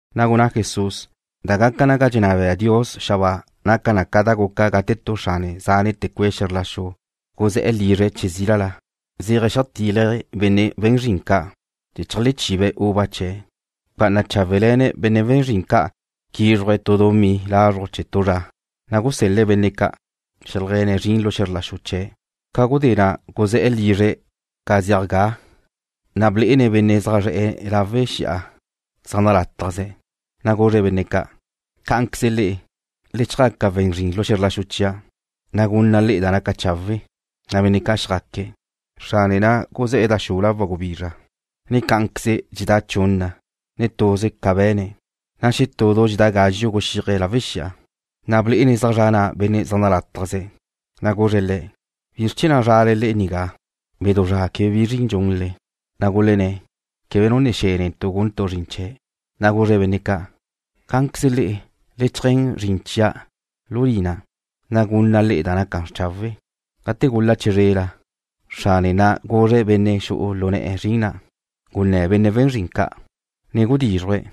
Na' gunná Jesús: ―Da gaca naga dxenná bea Dios xabáa naca na ca da guca gate tu xrane zánete̱ cue' xe̱zr la xu guzé̱'e̱ lizre̱' che zílala, zéaje̱' zeajtílaje̱' benne' we̱n zrin ca' chee̱ cheajlechibe̱' uva chee̱'. Bca'ana cháwele̱ne̱' benne' we̱n zrin ca' quízruje̱' tu dumí lazruj chee̱ tu zra, na' gusel-le̱' benne' ca' zeajlegue̱ne̱' zrin lu xe̱zr la xu chee̱'. Ca gudé na' guzé̱'e̱ lizre̱' ca dxedá na, na' blé'ene̱' benne' zaj zre̱'e̱ lawe' xi'a zaj nalátajze̱'. Na' guzre̱' benne' ca': “Cá'anqueze le'e, le chjaca we̱n zrin lu xe̱zr la xu chia', na' gunna' le'e da naca chawe'.” Na' benne' ca' xjaque̱'. Xrane na' guzé̱'e̱ da xula wa gubizra, ne cá'anqueze dxexedá' chunna, ne tuze ca be̱ne̱'. Xetú du dxedá' gazxu' guxíaje̱' lawe' xi'a, na' blé'ene̱' zaj zra' na' benne' zaj nalátajzqueze̱', ne guzre̱' le̱': “¿Bizr chee̱ na' zrale le'e nigá bedú zra quebe bi zrin dxunle?” ’Gulenné̱': “Quebe nu ne xe̱ netu' guntu' zrin chee̱'.” ’Na' guzre̱' benne' ca': “Cá'anqueze le'e, le cheajé̱n zrin lu lina chia', na' gunna' le'e da naca chawe'.” Gate gul-la' chizrela, xrane na' guzre̱' benne' xu'u lu ne̱'e̱ zrin na': “Gunné̱ benne' we̱n zrin ca', ne gudízruje̱',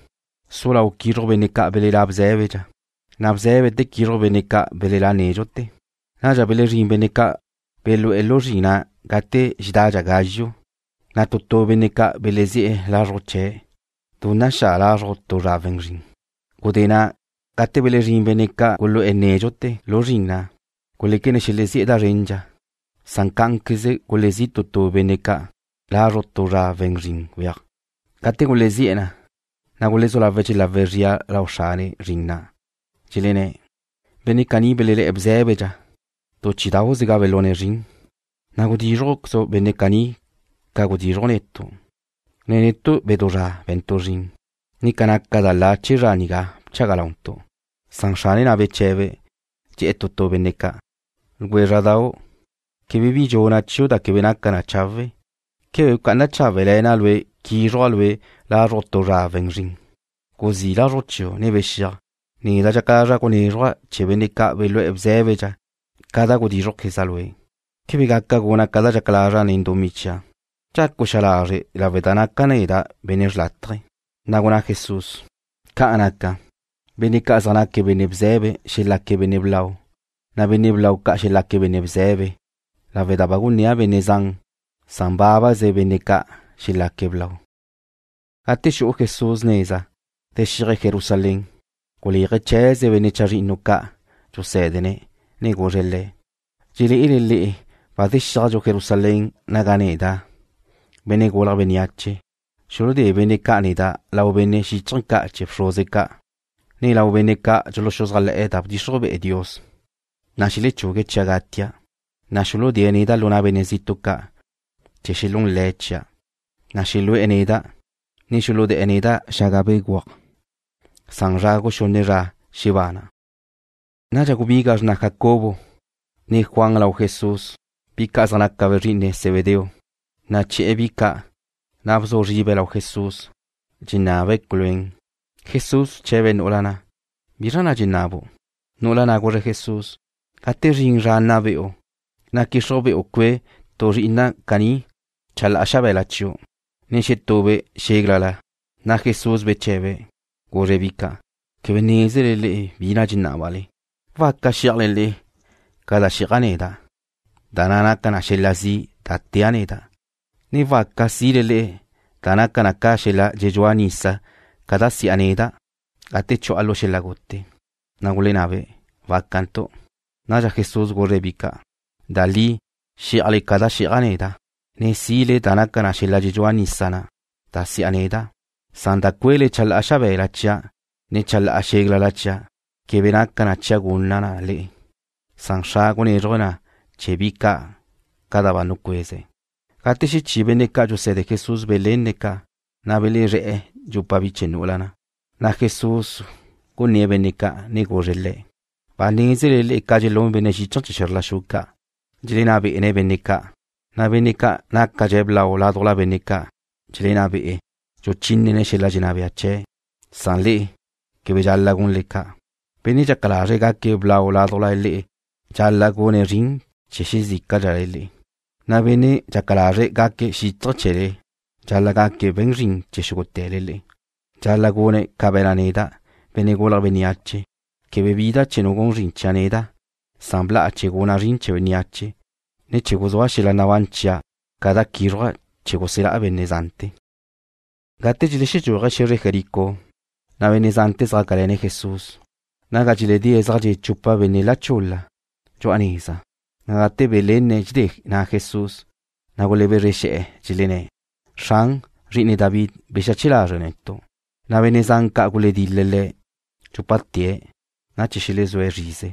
su lau' quízruju' benne' ca' belelá' bzé̱bedxa, na' bzé̱bete̱ quízruju' benne' ca' belelá' nédxute̱.” Nadxa belezrín benne' ca' belú'e̱ lu zrin na' gate dxexedadxa gazxu', na' tu tu benne' ca' belezi'e̱ lazruj chee̱' du naxá' lazruj tu zra we̱n zrin. Gudé na' gate belezrín benne' ca' gulu'e̱ nédxute̱ lu zrin na', guléquene̱' xelezí'e̱ da zrendxa, san cá'anqueze gulezí' tu tu benne' ca' lazruj tu zra we̱n zrin weaj. ’Gate gulezí'e̱ na, na' gulezú lawe̱' dxelawe̱' zria lau xrane zrin na', dxelenné̱': “Benne' caní belelá' bzé̱bedxa, tu chí'idau'ze ga belune̱' zrin, na' gudízrujquezu' benne' caní ca gudízruju' netu', na' netu' bedú zra be̱ntu' zrin, ne ca naca da la chee̱ zra nigá bchaga launtu'.” ’Beche̱be̱ xrane na', dxe̱'e̱ tu benne' ca': “Ljwézra'dau', quebe bi dxuna' chiu' da quebe naca na chawe'. ¿Quebe bca'ana cháwele̱na' lue' quízruja' lue' lazruj tu zra we̱n zrin? Guzí' lazruj chiu', ne bexíaj. Neda' dxaca lazra' gunézruja' chee̱ benne' ca' belú'e̱ bzé̱bedxa ca da gudízrujqueza' lue'. ¿Quebe gaca guna' ca da dxaca lazra' nen dumí chia'? ¿Dxacu' xa lazre' lawe' da naca' neda' benne' xrlátaje?” Na' gunná Jesús: ―Ca'an naca, benne' ca' zaj naca benne' bze̱be xelaque̱' benne' blau, na' benne' blau ca' xelaque̱' benne' bze̱be lawe' da ba gunnía' benne' zan, san bábaze benne' ca' xelaque̱' blau. Gate xu'u Jesús neza, zexíaje̱' Jerusalén, guléaje̱' chee̱ze benne' chazrinnu ca' dxusé̱dene̱', ne guzre̱' le̱': ―Dxelé'ele le'e ba zexíajdxu Jerusalén naga neda', Benne' Gulje̱' Bénneache, xuludé benne' ca' neda' lau benne' xíchaje̱ ca' chee̱ bxruze ca', ne lau benne' ca' dxuluxuzájle̱'e̱ da bdxixruj be'e Dios, na' xelechugue̱' chia' gatia'. Xuludée̱' neda' lu na' benne' zitu' ca' chee̱ xelún le̱' chia', na' xelu'e̱ neda', ne xuludé̱'e̱ neda' xaga béguaj, san zra guxunne zra xebana'. Nadxa gubiga xrna Jacobo, ne Juan lau Jesús, bi ca' zaj naca be̱' zri'ine Zebedeo, naché̱'e̱ bi ca', na' bzu zribe̱' lau Jesús, dxenabe̱' culuén. Jesús bche̱be̱' nu'ula na': ―¿Bi na' dxenabu'? Nu'ula na' guzre̱' Jesús: ―Gate zrin zra nna be'u, na' gudxixruj be'e cue' tu zri'ina' caní chalá'a xabe̱la chiu', ne xetube' xéglala. Jesús beche̱be̱', guzre̱' bi ca': ―Quebe nézele le'e bi na' dxenábale. ¿Waca xí'ajle le'e ca da xí'aja' neda', da na' naca na ca xel-la' zi' da tea' neda', ne waca si'le da naca na ca xel-la' dxedxúa nisa ca da si'a neda' gate chu'a lu xel-la' gute? Na' gulenabe': ―Wácantu'. Nadxa Jesús guzre̱' bi ca': ―Da li xí'ajle ca da xí'aja' neda', ne si'le da naca ca xel-la' dxedxúa nisa na' da si'a neda', san da cue'le chalá'a xabe̱la chia', ne chalá'a xéglala chia' quebe naca na chia' gunna' na le'e. Xra' gunézruje̱' na chee̱ bi ca' ca da ba nucueze̱'. Gate xechí benne' ca' dxuse̱de Jesús belenne̱' ca', na' belezré̱'e̱ dxupa bi chee̱ nu'ula na'. Jesús gunné̱' benne' ca', ne guzre̱' le̱': ―Ba nézele le'e ca dxelún benne' xíchaje̱ chee̱ xe̱zr la xu ca', dxelenná bé'ene̱' benne' ca', na' benne' nácadxe̱' blau ládujla benne' ca' dxelenná be'e̱, dxuchínene̱' xel-la' dxenná bea chee̱'. Le'e quebe dxal-la' gunle ca'. Benne' dxaca lazre̱' gaque̱' blau ládujla le'e dxal-la' gune̱' zrin chee̱ xezícadxale le'e, na' bénnea' dxaca lazre̱' gaque̱' xíchaje̱ chee̱le, dxal-la' gaque̱' we̱n zrin chee̱ xúgute̱le le'e. Dxal-la' gune̱' ca be̱na' neda', Benne' Gulje̱' Bénneache, quebe bida' chee̱ nu gun zrin chia' neda', san bla'a chee̱ guna' zrin chee̱ bénneache, ne chee̱ guzúa' xel-la' nabán chia' ca da quízruja' chee̱ guselá' benne' zante̱. Gate dxelexedxúaje̱' xe̱zre Jericó, na' benne' zante̱ zjácale̱ne̱' Jesús. Naga dxeledée̱' zaj dxe' chupa benne' la chul-la dxu'a neza, na' gate belenne̱' dxedé Jesús na' gulebezre xe̱'e̱, dxelenné̱': ―Xran, Zri'ine David, bexache lazre' netu'. Benne' zan ca' guledil-le̱' dxúpate̱' na' chee̱ xelezúe̱' zrize,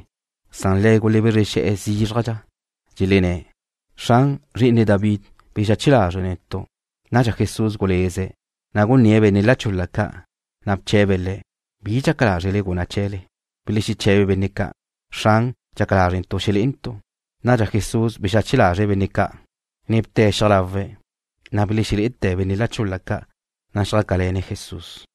san le̱' gulebezre xe̱'e̱ zízrajdxa, dxelenné̱': ―Xran, Zri'ine David, bexache lazre' netu'. Nadxa Jesús guleze̱', na' gunné̱' benne' la chul-la ca', na' bche̱be̱' le̱': ―¿Bi dxaca lázrele guna' chee̱le? Belexeche̱be benne' ca': ―Xran, dxaca lázrentu' xelé'entu'. Jesús bexache lazre̱' benne' ca', ne bte̱' xiaj lawe̱'. Na' belexelé'ete̱ benne' la chul-la ca', na' xjácale̱ne̱' Jesús.